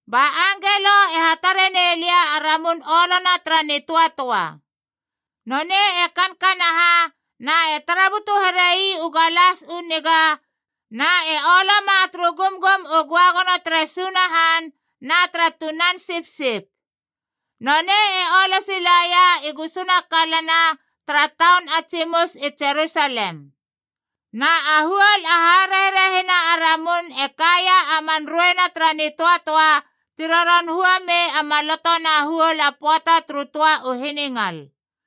Ba angelo e hatare nei lia a ramun olona tara nitöatöa. Nonei e kankanaha na e tara butu here ii u galas u niga na e oloma turu gumgum u göagono tere Sunahan na tara Tunan Sipsip. Nonei e olo silaia i gusuna kalana tara taun a tsimus i Jerusalem. Na a huol a harerehina a ramun e kaia a man rueina tara nitöatöa ti roron hua mei a maloto na huol a pöata turu töa u hiningal.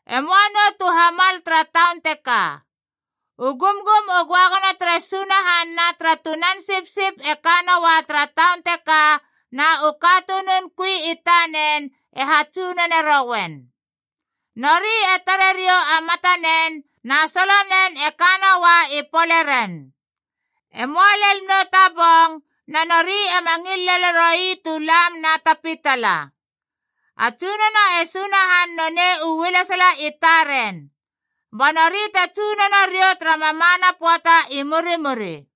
E möa nou tu hamal tara taun teka. U gumgum u göagono tere Sunahan na tara Tunan Sipsip e ka noua tara taun teka, na u katunun kui i tanen e hatsunone rouen. Nori e tare riou a matanen, na solonen e ka noua i poleren. E möa lel nou ta bong, na nori ema ngil lele roi tu lam na ta pitala. A Tsunono e Sunahan nonei u ualesala i taren. Ba nori te tsunono riou tara mamana pöata i murimuri.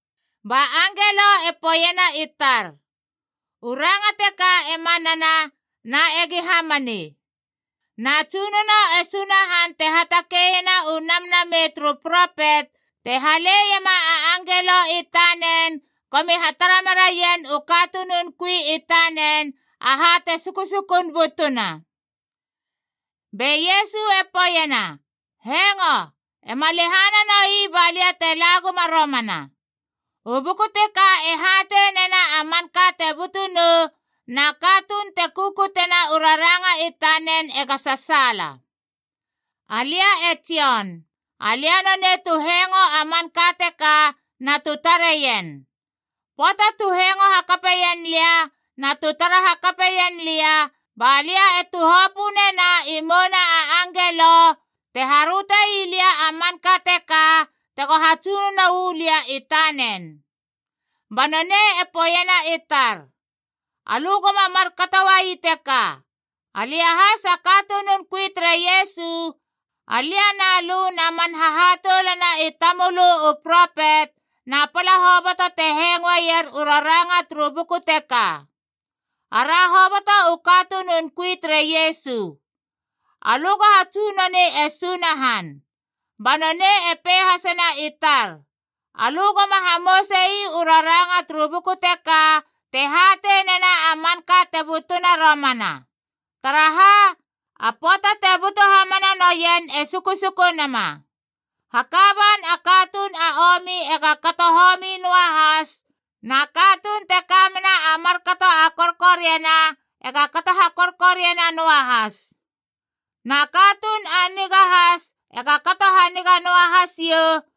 Ba angelo e poeiena i tar, “U ranga teka e manana na egi hamani. Na Tsunono e Sunahan te hatakeiena u namnamei turu propet te haleiema a angelo i tanen gomi hatara meraien u katunun kui i tanen aha te sukusukun butuna.” Be Iesu e poeiena, “Hengo! Ema lehana noi ba lia te la guma romana. U buku teka e hatei nena a manka te butu nou, na katuun te kukutena u raranga i tanen ega sasaala.” Alia e Jon. Alia nonei tu hengo a manka teka na tu tareien. Pöata tu hengo hakapeien lia na tu tara hakapeien lia, ba lia e tuhopö nena i mouna a angelo te haröte ii lia a manka teka tego hatsunono uu lia i tanen. Ba nonei e poeiena i tar, “Alö goma markato uai teka! Alia has a katunun kui tere Iesu, alia na lö na man hahatoulana i tamölö u propet, na pala hoboto te hengoeier u raranga turu buku teka. Ara hoboto u katunun kui tere Iesu. Alö go hatsunoni e Sunahan!” Ba nonei e pei hasena i tar, “Alö goma hamouse ii u raranga turu buku teka te hatei nena a manka te butuna romana. Taraha? A pöata te butu hamana noien e sukusuku nama. Haka ban a katuun a omi ega kato homi noa has, na katuun te ka mena a markato a korkoriana ega kato hakorkoriana noa has. Na katuun a niga has ega kato haniga noa has iou,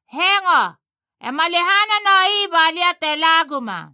“Hengo! Ema lehana noi balia te la guma.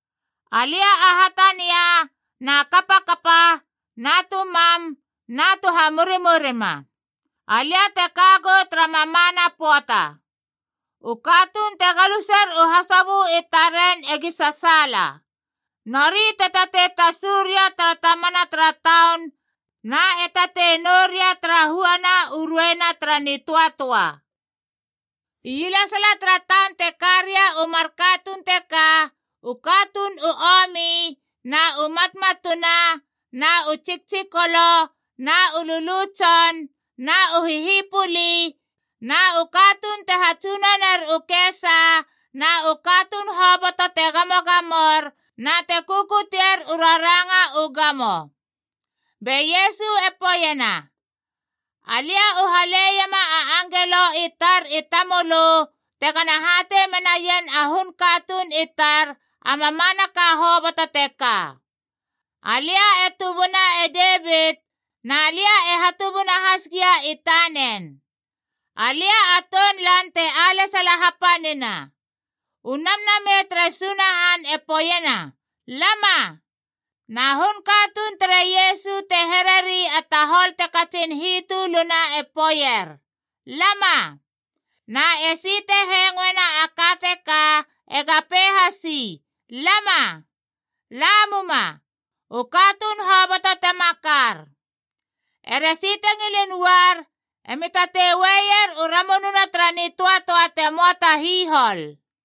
Alia a Hatania na Kapakapa na tu Mam na tu Hamurimurima. Alia te ka gou tara mamana pöata.” U katuun te galuser u hasobö i taren egi sasaala.d Nori te tatei tasu ria tara tamana tara taun na e tatei nou ria tara huana u rueina tara nitöatöa. Ielesala tara taun te ka ria u mar katuun teka: u katuun u omi,e na u matmatuna, na u tsiktsikolo na u lulu tson, na u hihipuli, na u katuun te hatsunoner u kesa, na u katuun hoboto te gamogamor na te kukutier u raranga u gamo. Be Iesu e poeiena, “Alia u haleiema a angelo i tar i tamölö tegana hatei menaien a hun katuun i tar a mamanaka hoboto teka. Alia e tubuna e Devit, na lia e hatubuna has gia i tanen.f Alia a Tounlan te alesala hapanina.” U Namnamei tere Sunahan e poeiena, “Lama!”g Na hun katuun tere Iesu te hereri a tahol te katsin hitöluna e poeier, “Lama!” h Na esi te hengoena a ka teka ega pei hasi, “Lama!” La muma, u katuun hoboto te makar. Eresi te ngilin uar emi tatei ueier u ramununa tara nitöatöa te möa ta hihol.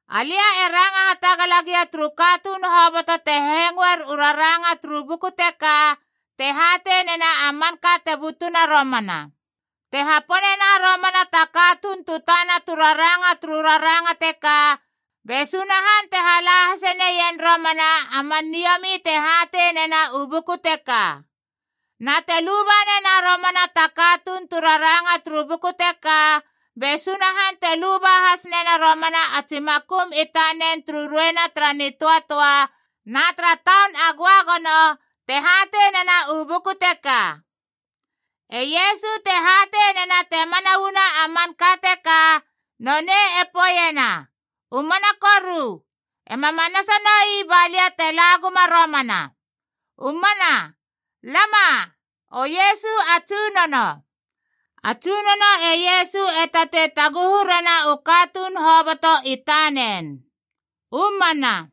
Alia e ranga hatagala gia turu katuun hoboto te hengoer u raranga turu buku teka te hatei nena a manka te butuna romana: te haponena romana ta katuun tu tana tu raranga turu raranga teka, be Sunahan te halai hase neien romana a man niomi te hatei nena u buku teka. Na te luba nena romana ta katuun tu raranga turu buku teka, be Sunahan te luba has nena romana a tsi makum i tanen turu rueina tara nitöatöa na tara Taun a Göagono, te hatei nena u buku teka. E Iesu, te hatei nena te mana uana a manka teka, nonei e poeiena, “U mana koru, ema manasa noi ba lia te la guma romana!” U mana. Lama, o Iesu a Tsunono! A Tsunono e Iesu e tatei taguhu rena u katuun hoboto i tanen. U mana.